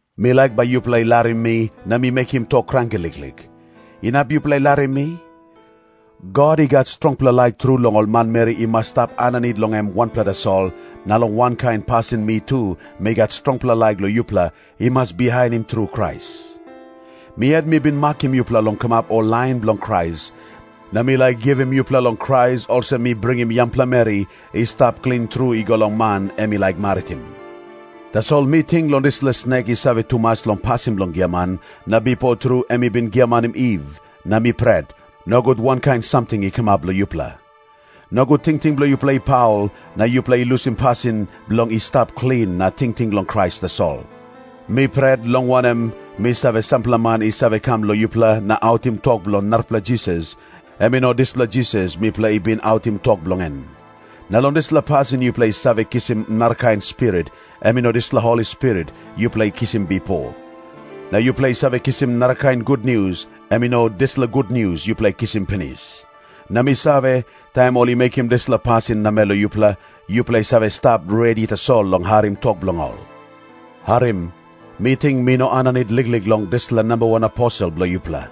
Mi laik bai yupela i larim mi na mi mekim tok kranki liklik. Inap yupela i larim mi? God i gat strongpela laik tru long ol manmeri i mas stap aninit long em wanpela tasol, na long wankain pasin mi tu mi gat strongpela laik long yupela i mas bihainim tru Krais. Mi yet mi bin makim yupela bilong kamap ol lain bilong Krais, na mi laik givim yupela long Krais olsem mi bringim yangpela meri i stap klin tru i go long man em i laik maritim. Tasol mi ting long dispela snek i save tumas long pasin bilong giaman, na bipo tru em i bin giamanim Iv, na mi pret, nogut wankain samting i kamap long yupela. Nogut tingting bilong yupela i paul, na yupela i lusim pasin bilong i stap klin na tingting long Krais tasol. Mi pret, long wanem, mi save, sampela man i save kam long yupela na autim tok bilong narapela Jisas, em i no dispela Jisas mipela i bin autim tok bilong en. Na long dispela pasin yupela i save kisim narakain spirit, em i no dispela Holi Spirit yupela i kisim bipo. Na yupela i save kisim narakain gutnius, em i no dispela gutnius yupela i kisim pinis. Na mi save, taim ol i mekim dispela pasin namel long yupela, yupela i save stap redi tasol long harim tok bilong ol. Harim. Mi ting mi no aninit liklik long ol dispela “namba wan aposel” bilong yupela.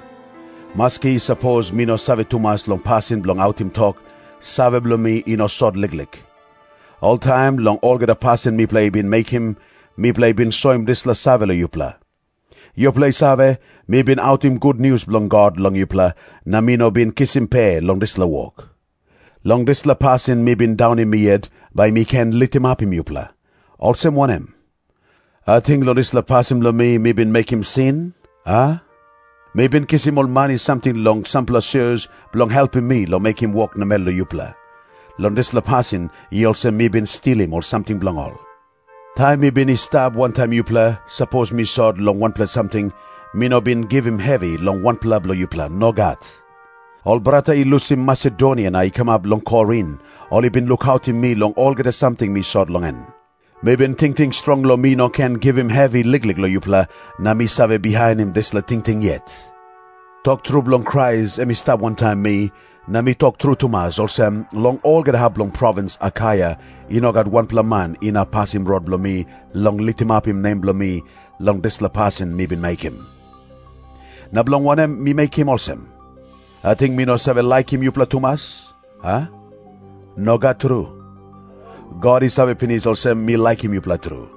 Maski sapos mi no save tumas long pasin bilong autim tok, save bilong mi i no sot liklik. Oltaim long olgeta pasin mipela i bin mekim, mipela i bin soim dispela save long yupela. Yupela i save, mi bin autim gutnius bilong God long yupela, na mi no bin kisim pe long dispela wok. Long dispela pasin mi bin daunim mi yet, bai mi ken litimapim yupela. Olsem wanem? Ating long dispela pasin bilong mi, mi bin mekim sin, a? Mi bin kisim ol mani samting long sampela sios, bilong helpim mi long mekim wok namel long yupela. Long dispela pasin i olsem mi bin stilim ol samting bilong ol. Taim mi bin i stap wantaim yupela, sapos mi sot long wanpela samting, mi no bin givim hevi long wanpela bilong yupela. Nogat. Ol brata i lusim Masedonia na i kamap long Korin, ol i bin lukautim mi long olgeta samting mi sot long en. Mi bin tingting strong long mi no ken givim hevi liklik long yupela, na mi save bihainim dispela tingting yet. Tok tru bilong Krais em i stap wantaim mi, na mi tok tru tumas olsem, long olgeta hap bilong provins Akaia i no gat wanpela man inap pasim rot bilong mi long litimapim nem bilong mi long dispela pasin mi bin mekim. Na bilong wanem mi mekim olsem? Ating mi no save laikim yupela tumas, a? Nogat tru. God i save pinis olsem, mi laikim yupela tru.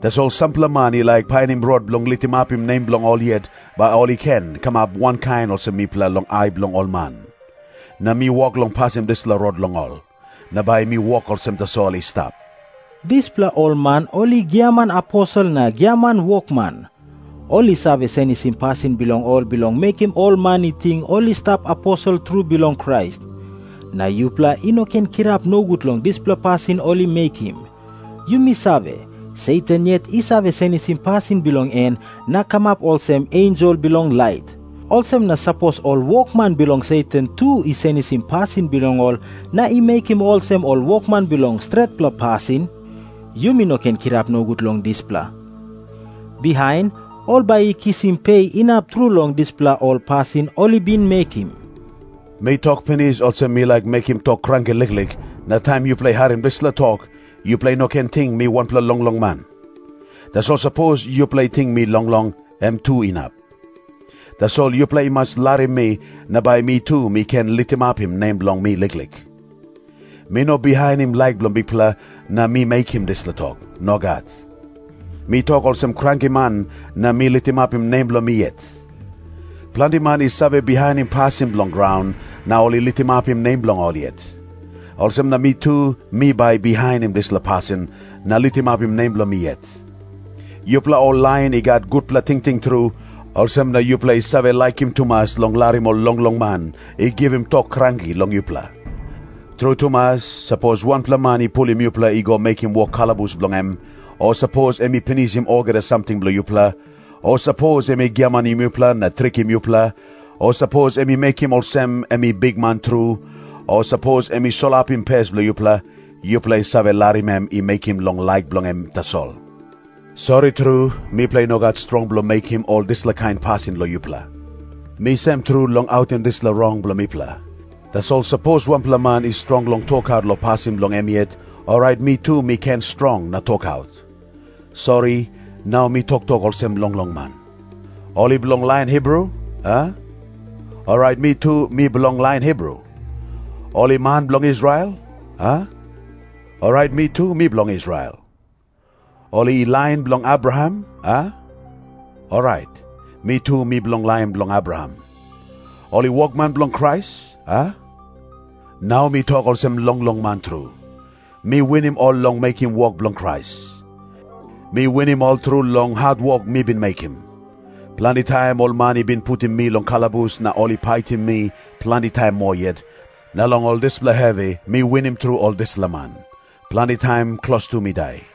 Tasol sampela man i laik painim rot bilong litimapim nem bilong ol yet, bai ol i ken kamap wankain olsem mipela long ai bilong ol man. Na mi wok long pasim dispela rot long ol. Na bai mi wok olsem tasol i stap. Dispela ol man ol i giaman aposel na giaman wokman. Ol i save senisim pasin bilong ol bilong mekim ol man i ting ol i stap aposel tru bilong Krais. Na yupela i no ken kirap nogut long dispela pasin ol i mekim. Yumi save, Satan yet i save senisim pasin bilong en na kamap olsem ensel bilong lait. Olsem na sapos ol wokman bilong Satan tu i senisim pasin bilong ol na i mekim olsem ol wokman bilong stretpela pasin, yumi no ken kirap nogut long dispela. Bihain ol bai i kisim pe inap tru long dispela ol pasin ol i bin mekim. Mi tok pinis olsem mi laik mekim tok kranki liklik, na taim yupela i harim dispela tok, yupela i no ken ting mi wanpela longlong man. Tasol sapos yupela i ting mi longlong, em tu inap. Tasol yupela i mas larim mi, na bai mi tu mi ken litimapim nem bilong mi liklik. Mi no bihainim laik bilong Bikpela na mi mekim dispela tok. Nogat. Mi tok olsem krankiman na mi litimapim nem bilong mi yet. Planti man i save bihainim pasin bilong graun na ol i litimapim nem bilong ol yet. Olsem na mi tu mi bai bihainim dispela pasin na litimapim nem bilong mi yet. Yupela ol lain i gat gutpela tingting tru, olsem na yupela i save laikim tumas long larim ol longlong man i givim tok kranki long yupela. Tru tumas, sapos wanpela man i pulim yupela i go mekim wok kalabus bilong em, o sapos em i pinisim olgeta samting bilong yupela, o sapos em i giamanim yupela na trikim yupela, o sapos em i mekim olsem em i bikman tru, o sapos em i solapim pes bilong yupela, yupela i save larim em i mekim long laik bilong em tasol. Sori tru, mipela i no gat strong bilong mekim ol dispela kain pasin long yupela. Mi sem tru long autim dispela rong bilong mipela. Tasol sapos wanpela man i strong long tokaut long pasin bilong em yet, orait mi tu mi ken strong na tokaut. Sori, nau mi toktok olsem longlong man. Ol i bilong lain Hibru, a? Orait, mi tu mi bilong lain Hibru. Ol i man bilong Israel, a? Orait, mi tu mi bilong Israel. Ol i lain bilong Abraham, a? Orait, mi tu mi bilong lain bilong Abraham. Ol i wokman bilong Krais, a? Nau mi tok olsem longlong man tru. Mi winim ol long mekim wok bilong Krais. Mi winim ol tru long hatwok mi bin mekim. Planti taim ol man i bin putim mi long kalabus na ol i paitim mi planti taim moa yet, na long ol dispela hevi mi winim tru ol dispela man. Planti taim klostu mi dai.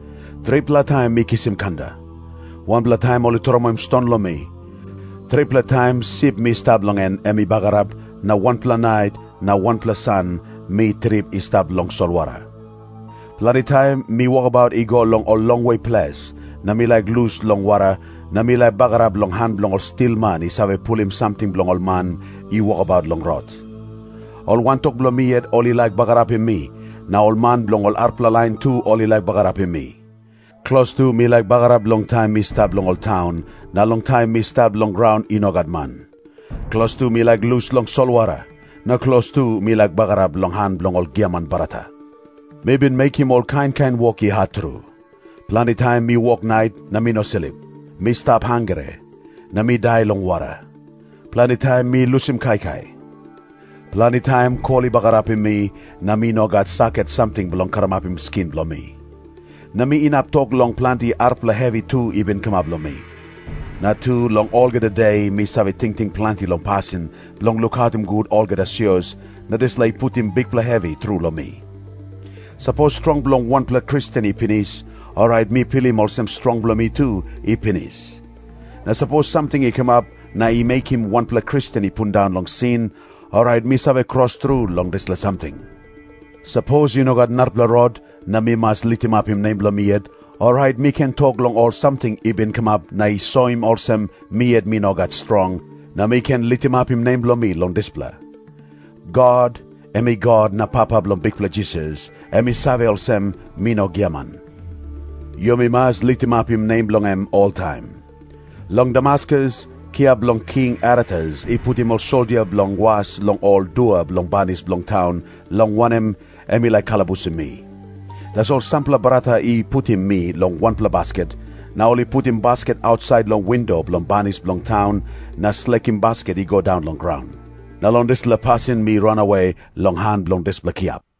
Tripela taim mi kisim kanda. Wanpela taim ol i tromoi ston long mi. Tripela taim sip mi stap long en, em i bagarap, na wanpela nait na wanpela san mi trip i stap long solwara. Planti taim mi wokabaut i go long ol longwe ples, na mi laik lus long wara, na mi laik bagarap long han bilong ol stilman i save pulim samting bilong ol man i wokabaut long rot. Ol wantok bilong mi yet ol i laik bagarapim mi, na ol man bilong ol arapela lain tu ol i laik bagarapim mi. Klostu mi laik bagarap long taim mi stap long ol taun, na long taim mi stap long graun i no gat man. Klostu mi laik lus long solwara. Na klostu mi laik bagarap long han bilong ol giaman brata. Mi bin mekim ol kain kain wok i hat tru. Planti taim mi wok nait na mi no slip. Mi stap hangre, na mi dai long wara. Planti taim mi lusim kaikai. Planti taim kol i bagarapim mi na mi no gat saket samting bilong karamapim skin bilong mi. Na mi inap tok long planti arapela hevi tu i bin kamap long mi. Na tu, long olgeta de mi save tingting planti long pasin bilong lukautim gut olgeta sios, na dispela i putim bikpela hevi tru long mi. Sapos strong bilong wanpela Kristen i pinis, orait mi pilim olsem strong bilong mi tu i pinis. Na sapos samting i kamap na i mekim wanpela Kristen i pundaun long sin, orait mi save kros tru long dispela samting. Sapos i no gat narapela rot, na mi mas litimapim nem bilong mi yet, orait mi ken tok long ol samting i bin kamap na i soim olsem mi yet mi no gat strong, na mi ken litimapim nem bilong mi long dispela. God, em i God na Papa bilong Bikpela Jisas, em i save olsem, mi no giaman. Yumi mas litimapim nem bilong em oltaim. Long Damaskus, kiap bilong King Aretas i putim ol soldia bilong was long ol dua bilong banis bilong taun, long wanem, em i laik kalabusim mi. Tasol sampela brata i putim mi long wanpela basket, na ol i putim basket ausait long windo bilong banis bilong taun na slekim basket i go daun long graun. Na long dispela pasin mi ranawe long han bilong dispela kiap.